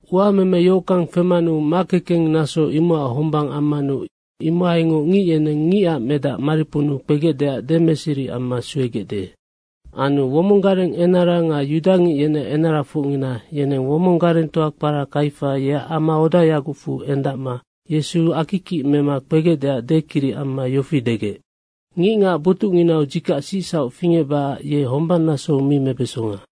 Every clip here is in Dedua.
“Uameme yohockang femanu makekeng naso imocac hombang ammanu imohaingoc ngic yeneng Ngicac Medac mariponnu kpegecdeac demeseri amma suegecde.” Anu womong gareng enara nga yudangic yeneac enarafocngina, yeneng womong garengtoa kpara Kaifa, yeac amaodayagocfu endacma Yesu akikic mema kpegecdeac dekiric amma yofi degec, “Ngicngac botucnginau dzikac sicsauc fingecbacac ye hombang nasou mi mebesonga.”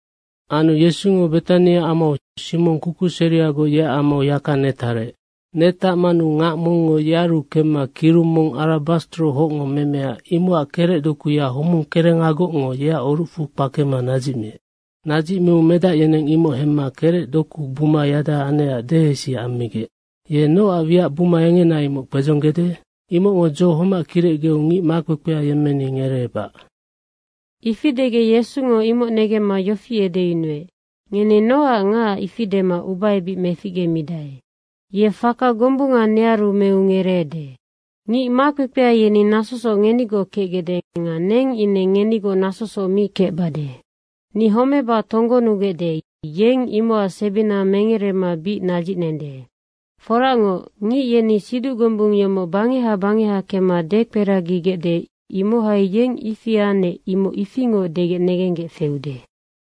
Anu Yesungo Betania amau Simong kukuseriagoc, yeac amau yaka netarec. Netacmanu ngac mongngo yearu kemma, kirung mong arabastro hocngo memea, imocac kerecdokuya homung kerengagocngo yeac orucfu kpakema nadzicmiec. Nadzicmiu medac yeneng imoc hemma kerecdoku buma yada anecac dehesi ammigec, “Ye nocac wiac buma engena imoc kpedzonggede? Imocngo dzo homac kirecgeu ngic makpekpea yemmeni ngereebac.” Ifi degec Yesungo imoc negemma yofi edeyunuec, “Ngeni nocac ngacac ifi dema ubaebic meficgemidae. Ye faka gombunga nearu meu ngereede. Ngic makpekpea yeni nasosoc ngenigoc kecgecde nga neng ine ngenigoc nasosoc mi kecbade. Ni homeba tonggonugecde, ye imocac sebina mengerema bic nadzicnende. Foracngoc, ngic yeni siduc gombung yomoc bangeha bangeha kemma dekperagigecde, imohai yeng ifi anec, imoc ifingoc degec negenggec feude.”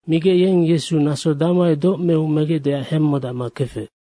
Migec, yeng Yesu naso damohai doc meu megecdeac hemmodacma kefec.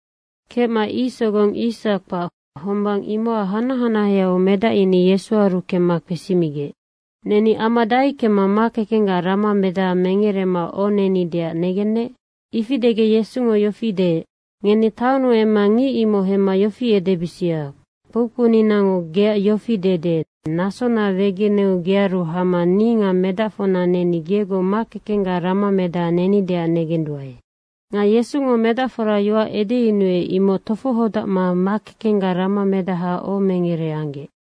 Kecma ic sogong yis kpac, hombang imocac hanac hanaheau medac yeni Yesuaru kemma kpesimigec, “Neni ama dahai kemma makekenggac ramamedaha mengerema ohonenideac negennec?” Ifi degec Yesungo yofi deec, “Ngeni taonnu emma ngic imoc hemma yofi edebisia, ‘Kpoukpouninango geac yofi dede, nasona wegeneu gearu hama ni nga medacfocna neni gegoc makekenggac ramamedaha nenideac negenduae.’” Nga Yesungo medacfora yoac edeyunuec, imoc tofohodacma makekenggac ramamedaha ohomengere anggec.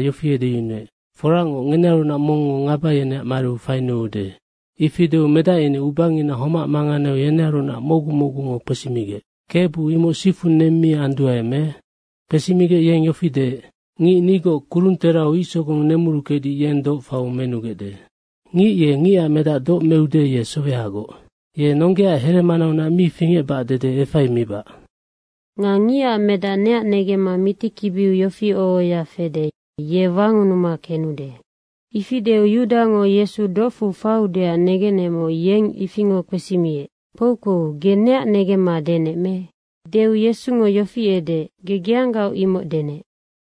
yofi edeyunuec, “Foracngoc, ngenearunac mongngo ngaba yeneac mariu fainuude.” Ifi deu medac yeni ubangina homac manganeu yenearunac mocgu mocgungo kpesimigec, “Kebu imoc sifu neng mi anduae, me?” Kpesimigec yeng yofi deec, “Ngic nigoc kurungterau ic sogong nemuruckedic, yennoc doc faiu menugecde. Ngic ye Ngicac Medac doc meude, ye sowehagoc. Ye nonggeaac here manaunac mi fingecbac dede efaimibac. Nga Ngicac Medac neac negemma mitikibiu yoac yofi oho ohoya fede, yeng wangunuma kenudenoc.” Ifi deu Yudango Yesu docfu faiudeac negenecmoc, yeng ifingoc kpesimiec, “Kpoukpou, ge neac denec me?” Deu Yesungo yofi edeec, “Ge geanggaoc imocnoc denec.”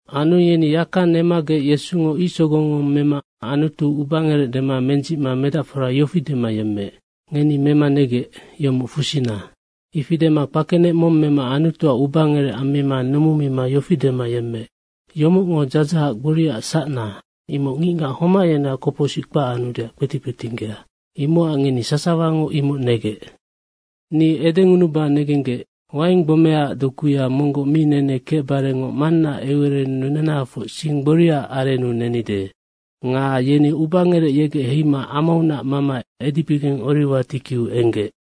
Anu yeni yaka nemagec Yesungo ic sogong mong mema Anutuac ubangerec dema mendzicma medacfora yofi dema yemmeec, “Ngeni mema negec, yomoc fusina.” Ifi dema kpakenec mong mema Anutuac ubangerec ammima numumima yofi dema yemmeec, “Yomocngo dzadzahac gboriaac sacna, imoc ngicngac homac yeneac kopocsic kpac anudeac kpetic kpetinggea, imocac ngeni sasawango imoc negec. Ni edengunuba negenggec, waing gbomeaac dokuya monggoc mi nene kecbarengoc Mannaac eucererennu nenahafoc sing gboriaac arennu nenide.” Nga yeni ubangerec yegec heima amaunac mama edibigeng Oriwa tikiu enggec.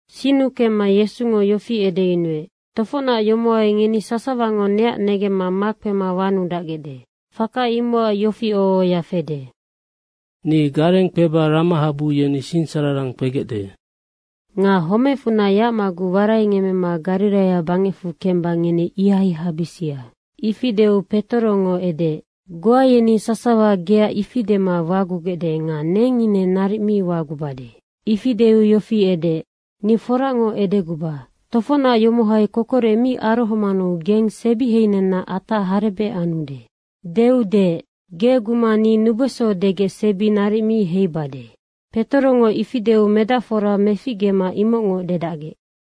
Sinnu kemma Yesungo yofi edeyunuec, “Tofocnac yomohai ngeni sasawango neac negemma makpema wanudacgecde. Faka imocac yofi oho ohoya fede, ‘Ni gareng kpeba ramahabu yeni sinsararang kpegecde.’ Nga homecfunac yacmaguc waraingemmema Gariraia bangecfu kemba ngeni ihai habisia.” Ifi deu Petorongo edeec, “Goa yeni sasawa geac ifi dema wagugecde nga neng ine naric mi wagubade.” Ifi deu yofi edeec, “Ni forangoc edeguba, tofocnac yomohai kokorec mi arohomanu geng sebiheinenna atac harebec anude.” Deu deec, “Ge guma ni nubeso degec sebi naric mi heibade.” Petorongo ifi deu medacfora meficgema imocngoc dedacgec.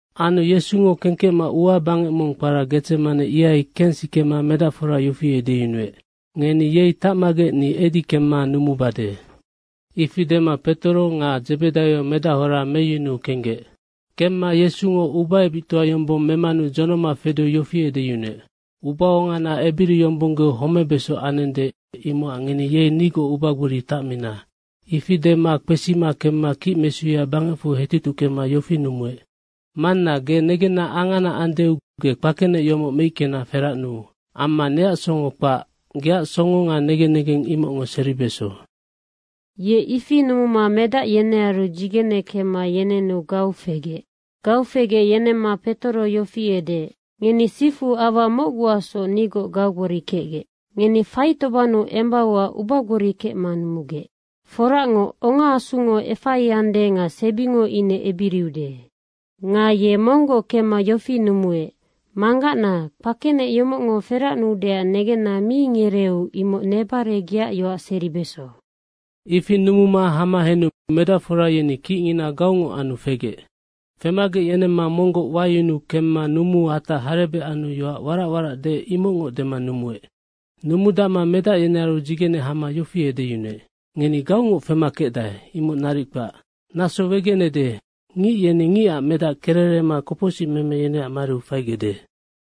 Anu Yesungo kengkecma ua bangec mong kpara Gedzemane, ihai kensikema medacfora yofi edeyunuec, “Ngeni yei tacmagec ni edi kemma numubade.” Ifi dema Petoro nga Dzebedaio medahora meyunuu kenggec. Kemma Yesungo ubaebictoa yombong memanu dzonoma fedeu yofi edeyunuec, “Ubaongana ebiriyombonggeu homebeso anende, imocac ngeni yei nigoc ubagbori tacmina.” Ifi dema kpesima kemma kicmesuya bangecfu hetutuckema yofi numuec, “Manna, negenna angana andeu ge kpakenec yomoc meickena feracnuu. Amma neac songo kpac, geac songo nga negen negeng imocngo seribeso.” Ye ifi numuma medac yenearu dzigene kemma yenenu gau fegec. Gau fegec yenemma Petoro yofi edeec, “Ngeni sifu aua mocguacsoc nigoc gaugbori kecgec. Ngeni faitobannu embauac ubagbori kecma numugec. Foracngoc, ongaasungo efaiande nga sebingo ine ebiriude.” Nga ye monggoc kemma yofi numuec, “Manggacna, kpakenec yomocngo feracnuudeac negenna mi ngereeu imoc nebare geac yoac seribeso.” Ifi numuma hama henu medacfora yeni kicngina gaungoc anu fegec. Femagec yenemma monggoc wayunu kemma numuu atac harebec anu yoac warac deec, imocngoc dema numuec. Numudacma medac yenearu dzigene hama yofi edeyunuec, “Ngeni gaungoc fema kecdae, imoc naric kpac. Naso wegenede, ngic yeni Ngicac Medac kererema kopocsicmeme yeneac mariu faigecde.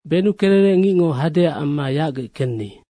Benukererec ngicngo hadeac amma yacgec kenni.”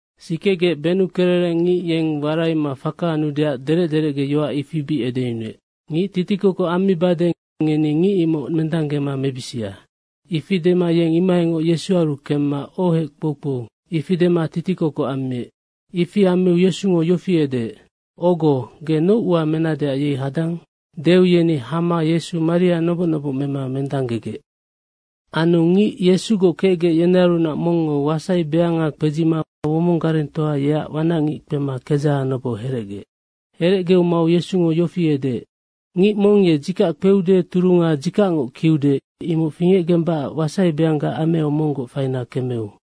Sikegec benukererec ngic yeng waraima faka anudeac derec derecgeyoac yofi bic edeyunuec, “Ngic titikokoc ammibade, ngeni ngic imocnoc mendanggema mebisia.” Ifi dema yeng imohaingoc Yesuaru kemma, “Ohec, kpoukpou.” ifi dema titikokoc ammiec. Ifi ammiu Yesungo yofi edeec, “Ogo, ge noc ua menadeac yei hadang?” Deu yeni hama Yesu maria noboc noboc mema mendanggegec. Anu ngic Yesugoc kecgec, yenearunac mongngo wasaibeanga kpedzima womong garengtoa yeac wanacngic kpema kedzaha noboc herecgeec. Herecgeu mau Yesungo yofi edeec, “Ngic mong ye dzikac kpeude turunga dzikacngoc kiude, imoc fingecgembacac wasaibeangga ameau monggoc faina kemeu.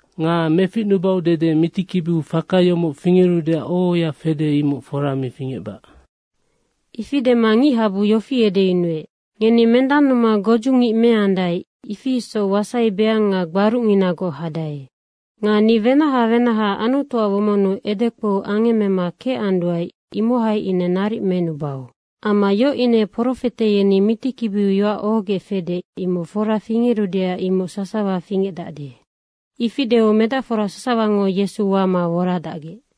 Nga meficnubau dede mitikibiu faka yomoc fingerudeac oho ohoya fede, imoc fora mi fingecbac.” Ifi dema ngichabu yofi edeyunuec, “Ngeni mendannuma godzungic meandae, ifi isoc wasaibeang nga gbarucnginagoc hadae. Nga ni wenaha wenaha Anutuac womonnu edekpou angemmema kecanduae, imohai ine naric menubau. Amma yoc ine profete yeni mitikibiu yoac ohogec fede, imoc fora fingerudeac imoc sasawa fingecdacde.” Ifi deu medacfora sasawango Yesu wama woradacgec.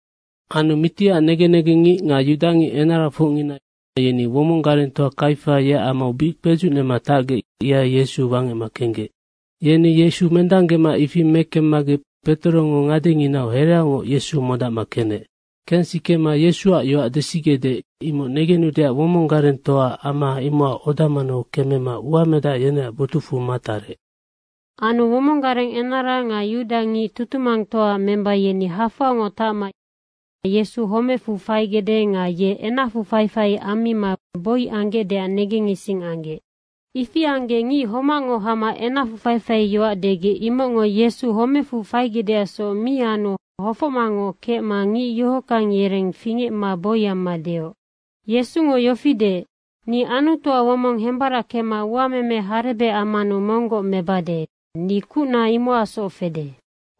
Anu mitiac negen negengngic nga yudangic enarafocngina yeni womong garengtoa Kaifa yeac amau bic kpedzucnema tacgec, ihai Yesu wangecma kenggec. Yeni Yesu mendanggema ifi mekemmagec Petorongo ngadenginau hereaungoc Yesu modacma kenec. Kensikema, Yesuac yoac desigecde, imoc negenudeac womong garengtoaac ama imocac oda manau kemema uamedac yeneac botucfu matarec. Anu womong gareng enara nga yudangic tutumangtoaac memba yeni hafoangoc tacma Yesu homecfu faigecde nga ye enacfu faifai ammima boi anggecdeac negengising anggec. Ifi anggec ngic homacngo hama enacfu faifaiyoac degec, imocngo Yesu homecfu faigecdeacsoc mi anu hofocmangoc kecma ngic yohockang yereng fingecma boi amma deoc, “Yesungo yofi deec, ‘Ni Anutuac womong hembarackema uameme harebec ammanu monggoc mebade, ni kucna imocacsoc fede.’”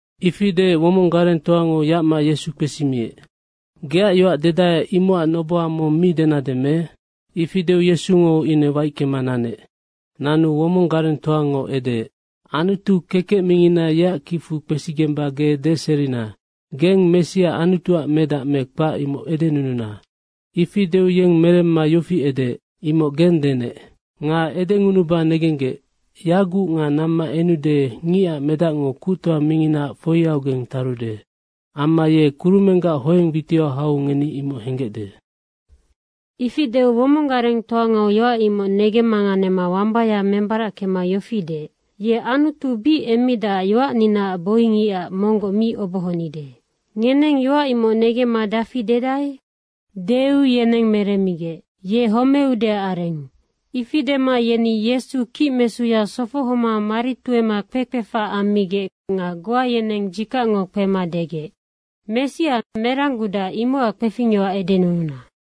Ifi deec womong garengtoango yacma Yesu kpesimiec, “Geac yoac dedae, imocac noboha mong mi denade me?” Ifi deu Yesungo ine waickema nanec. Nanu womong garengtoango edeec, “Anutu kekec mingina, yeac kicfu kpesigemba ge deserina, geng Messia Anutuac medac me kpac, imoc edenununa.” Ifi deu yeng meremma yofi edeec, “Imoc gennoc denec. Nga edengunuba negenggec, yaguc nga namma enude Ngicac Medacngo Kuctoa Minginaac foiaugeng tarude. Amma ye kurumenggac hoeng witiau hau ngeni imoc henggecde.” Ifi deu womong garengtoango yoac imoc negemmanganema wambaya membarackema yofi deec, “Ye Anutu bic emmidacac yoacninaac boingicac monggoc mi obohonide. Ngeneng yoac imoc negemma dafi dedae?” Deu yeneng meremmigec, “Ye homeudeac arennoc.” Ifi dema yeni Yesu kicmesuya sofohoma mari tuema kpekpefac ammigec nga goa yeneng dzikacngo kpema degec, “Messia, merang gudac, imocac kpefingyoac edenununa.”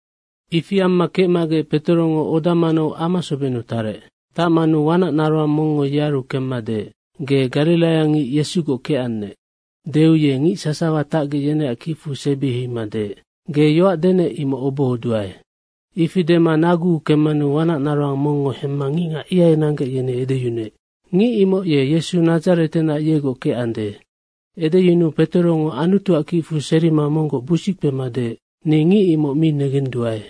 Ifi amma kecmagec Petorongo oda manau ama sobennu tarec. Tacmanu wanac naroang mongngo yearu kemma deec, “Ge gariraiangicnoc Yesugoc kecannec.” Deu ye ngic sasawa tacgec, yeneac kicfu sebi heima deec, “Ge yoac denec, imoc obohoduae.” Ifi dema naguu kemmanu wanac naroang mongngo hemma ngicngac ihai nanggec, yeni edeyunuec, “Ngic imoc ye Yesu Nadzaretenac, yegoc kecandenoc.” Edeyunuu Petorongo Anutuac kicfu serima monggoc busickpema deec, “Ni ngic imoc mi negenduae.”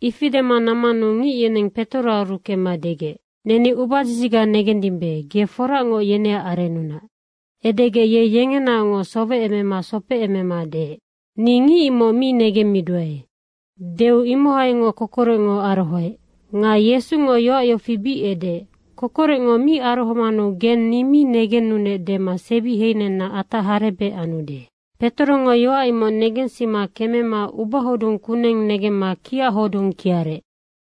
Ifi dema nammanu ngic yeneng Petoroaru kemma degec, “Neni ubadzidziga negendimbe, ge foracngoc yeneac arennunac.” Edegec ye yengenaoc sowecemema sopecemema deec, “Ni ngic imoc mi negemmiduae.” Deu imohaingoc kokorecngo arohoec. Nga Yesungo yoac yofi bic edeec, “Kokorecngo mi arohomanu geng ni mi negennunec dema sebiheina atac harebec anude.” Petorongo yoac imoc negensima kemema ubahodung kuneng negemma kiac hodung kiarec.